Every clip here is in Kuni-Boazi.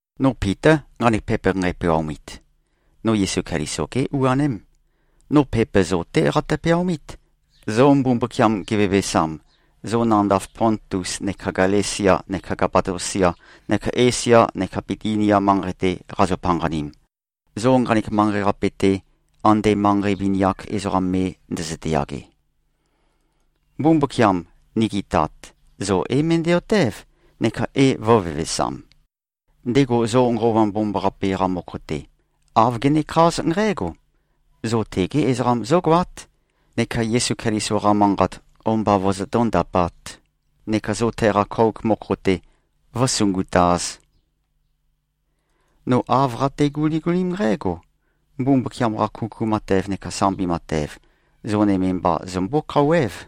No Pitá, nqanek pepa nqæpeaomit. No Yesu Keliso-gé u-aném. No pepa zo-té qatø-peaomít, zo Mbumbukiam gevevesam, zo nandav Pontus neka Galesia neka Kapadosia neka Esia neka Bitinia manqei-te qazo-panqanim, zo nqanek manqei-qape-te ande manqei vini-ak ezoqam me ndøzøte-yage. Mbumbukiam, nigi Tat, zo é-møndæ-otév, neka é-vø̄vevesam. Ndego zo Nqova Mbomambaqape-qa mokho-te, āv genekház nqǽgo: Zo tegé ezoqam zógoát, neka Yesu Keliso-qa manqat o-mba vozotó-ndapāt neka zo teqa kouk mokho-te vǿsungutāz. No āv qate-guligulím nqǽgo: Mbumbukiam-qa kuku matev neka sambi matev, zo nøme mba zømbó-khouwév.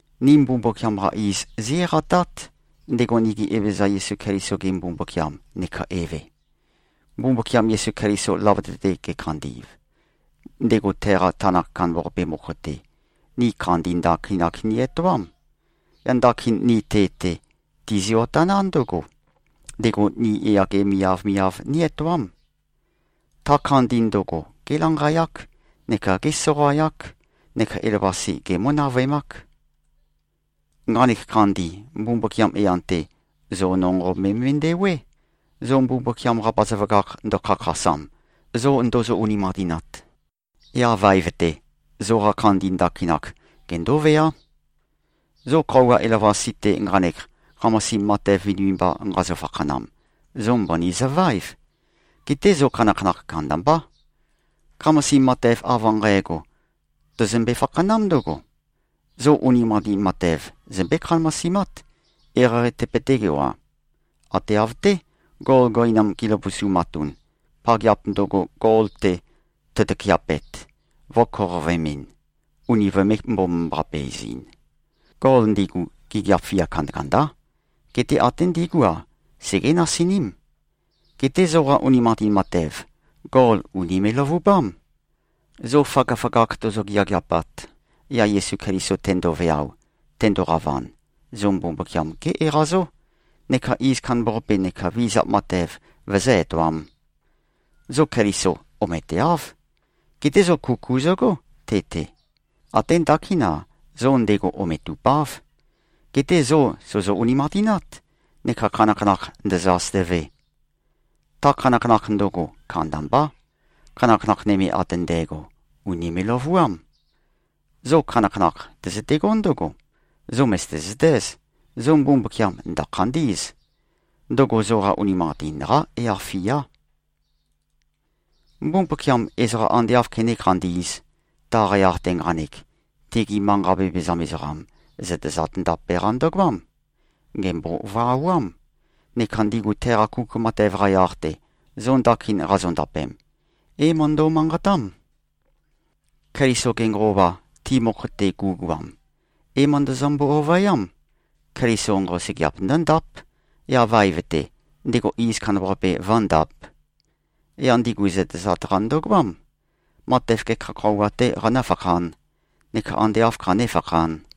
Ni Mbumbukiam-qa iz, zí-eqatát, ndego nigi Evezøza Yesu Keliso-ge Mbumbukiam neka Eve. Mbumbukiam Yesu Keliso løvøte-te gekhandi꞉v, ndego teqa tanakh kandambaqape mokho-te, ni khandi ndakinak ni-etoám. Yaq ndakin ni te-te, tizio-taná ndǿgo: Ndego ni yage miavmiav ní-etoám. Ta khandi ndøgo, gélanqayák neka gésoqayák neka elavøqase gemǿ-navøemák. Nqanek khandi, Mbumbukiam yan-te, zo nonqo me꞉mendewé, zo Mbumbukiam-qa bazaføgakh ndøkhakhasam, zo ndozo-unimanqatinat. Yaq vaev-te, zoqa khandi ndakinak gendóveá. Zo khøuwa elavøqasi-te nqanek, khamasim matev vinivinimba nqazø-fakhanam, zo mbøni zøvaév. Geté zo khanakhanakh kandambá. Khamasim matev av nqægo, tøzømbe-fakhanám ndǿgo: Zo unimanqatin matev zømbé-khamasimát, eqeieqei tøpøtégo-a. Ate av-té, gol gøinam gi꞉løvusumatun, pageap ndøgo, gol-te tøtøkeapet, vø̄koqovøemɨn, uni vømē-mbomambaqape-ezɨn. Gol ndigu, gigiap fia kandakandá. Geté até ndigú-a, segé-nasiním. Geté zoqa unimanqatin matev, gol ùnime꞉-løvubám. Zo føgøføgakh tozo-geageapat, yaq Yesu Keliso tendoveao, tendoqavan, zo Mbumbukiam gé-eqazó, neka iz kandambaqape neka vizap matev vøzǿ-etoām. Zo Keliso ometeáv. Geté zo kuku zøgó, te-te. Até ndakín-a, zo ndego ometupáv. Geté zo sòzo-unimanqatinát, neka khanakhanakh ndø̄zø̄-āsø̄tø̄vē. Ta khanakhanakh ndøgo, kandambá. Khanakhanakh nøme ate ndægo, ùnime꞉-løvuám. Zo khanakhanakh tøzøtegó ndǿgo: Zo mø̀zøte-zøtéz, zo Mbumbukiam ndø̀khandí꞉z. Ndøgo zoqa unimanqatin-qá yaq-fiá. Mbumbukiam ezoqa ande āv kené-khandī꞉z, taqa yaq-te nqanek, tegi manqa vevezam ezoqam, zøtezat ndape-qa ndøgoám. Gèmbovawám. Neka ndigu teqa kuku matev-qa yaq-te, zo ndakin qazondapem, é-møndo꞉-manqatám. Keliso-ge Nqova, ti mokho-te gu꞉goam, é-møndøzømbo-ovøyám, Keliso nqosøgeap ndǿndáp, yaq vaev-te, ndego iz kandambaqape vǿndāp. Yaq ndigu zøtezat-qa ndøgoám: Matev gekha khøuwa-tē qanǿfakhān, neka ande āv khanéfakhān?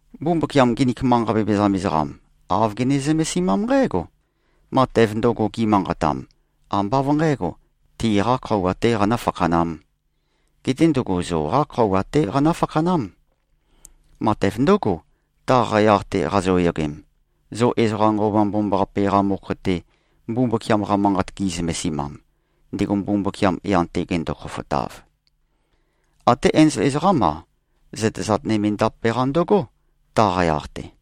Mbumbukiam nginik manqa vevezam ezoqam, āv gene-zømesimám nqǽgo: Matev ndøgo, gi꞉manqatam, ambá av nqǣgo, tiqā khøuwa-tē qanǿ-fakhanām. Geté ndøgo zoqá khøuwa-té qanǿ-fakhanám. Matev ndǿgo, taqa yaq-te qazoyogem, zo ezoqa Nqova Mbomambaqape-qa mokho-te, Mbumbukiam-qa Manqat gi꞉zømesimam, ndego Mbumbukiam yan-te gendo-khofotav. Até enzol ezoqám-a, zøtezat nøme ndape-qa ndøgó, taqa yaq-te.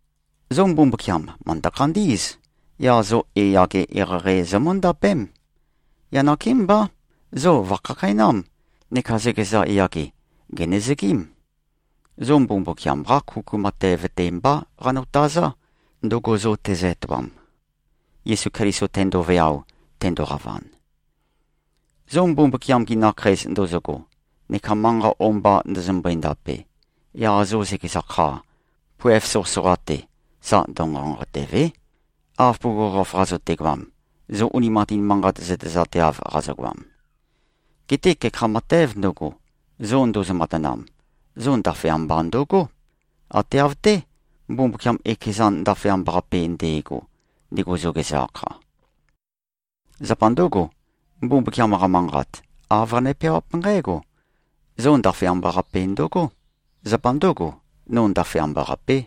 Zo Mbumbukiam, mø̀ndø-khandí꞉z. Yaq zo yage eqeieqei zomǿndapém. Yaq nakémbá, zo vø̀khakheinám, neka zøkeza yage, gènøzøgím. Zo Mbumbukiam-qá kuku matev-te mbá qanotazá, ndøgo zo tezø-etoam, Yesu Keliso tendoveao, tendoqavan. Zo Mbumbukiam-gi nakheis ndozogo neka manqa o-mba ndøzømbøe-ndape, yaq zo zøkeza kha, poev soqøsoqa-te, sa ndønqonqotø̀ve᷄, av bugukhokhof qazøtegoam, zo unimanqatin manqat zøtezateav qazogoam. Geté gekha matēv ndøgo, zo ndozo-matanam, zo ndaføyamba ndøgó, ate av-té, Mbumbukiam ekezan ndaføyamba-qape nde꞉go, ndego zo gezø-akha. Zapa ndǿgo, Mbumbukiam-qa Manqat, āv qane-peawáp nqǽgo, “Zo ndaføyamba-qape ndøgó. Zapa ndǿgo, no ndaføyamba-qapé.”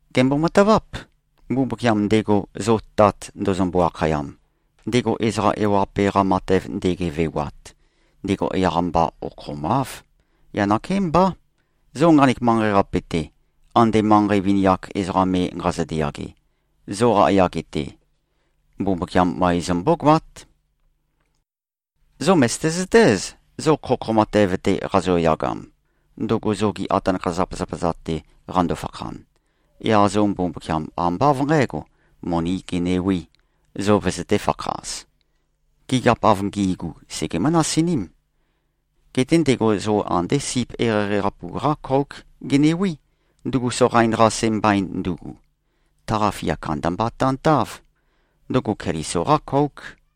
Gèmbo-mataváp. Mbumbukiam ndego, zo Tat ndozombo-akhayam, ndego ezoqa ewaqape-qa matev ndegevewat, ndego yaq-mba okhomáv. Yaq nakémbá, zo nqanek manqei-qape-te, ande manqei vini-ak ezoqa me nqazøte-yage, zoqa yage-te, Mbumbukiam møe zombógoát. Zo mø̀zøte-zøtéz, zo khokho matev-te qazoyagam, ndøgo zogi atanakha-zapazapa-za-te qando-fakhan, yaq zo Mbumbukiam ambá av nqǣgo, monī genewī, zo vøzøtē-fakhaz. Gigiap av ngi꞉gu, segemǿ-nasiním. Geté ndego zo andé sip eqeieqei-qapu-qá kóuk genewí, ndugu soqain-qase mbain ndugu. Taqa fia kandamba tantáv. Ndøgo Keliso-qá kóuk.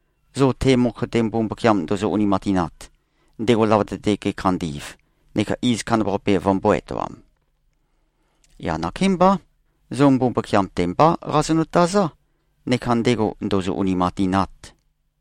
zo te mokho-te Mbumbukiam ndozo-unimanqatinat, ndego løvøte-te gekhandi꞉v neka iz kandambaqape vømbō-etoam. Yaq nakémbá, zo Mbumbukiam-te mbá qazonø-tazá, neka ndego ndōzō-ūnīmānqātīnāt.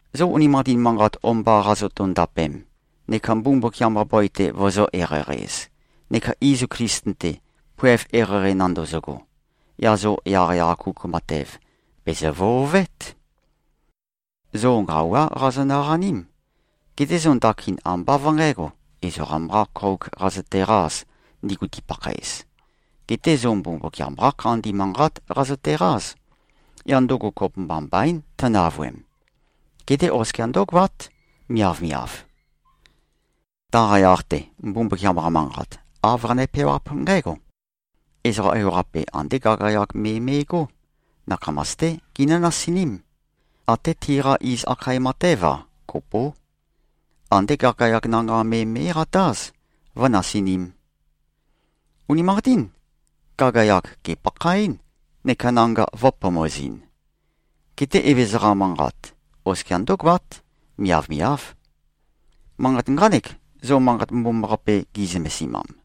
Zo unimanqatin manqat o-mba qazoto-ndapem neka Mbumbukiam-qa bøi-te vozō-eqeieqei-ez, neka izu Klisten-te, poev eqeieqei nandøzøgo, yaq zo yaqyaq-a kuku matev, bèzø-vøovét. Zo nqawá qazonø-qaním. Geté zo ndakin ambá av nqǣgo, ezoqam-qā kōuk qazøteqāz, ndigu tipakhaez. Geté zo Mbumbukiam-qá khandi manqát qazøteqáz. Yaq ndøgo kopømba mbaín, tønavøem. Geté oskia ndǿgoát, miavmiav. Taqa yaq-te, Mbumbukiam-qa Manqat, āv qane-peawáp nqǽgo, “Ezoqa ewaqape andé gagayag me me꞉gó. Nakhamas-té ginǿ-nasiním. Até tiqá iz akhae matév-a, kopó. Andé gagayag nanga me mé꞉qatáz, vǿnasinīm. Unimanqatín. Gagayag gèpakhaɨ́n, neka nanga vø̄pomozɨn. Geté Evezøza-qa manqat, oskia ndǿgoát. Miavmiáv.” Manqat nqánek, zo Manqat Mbomambaqape gi꞉zømesimam.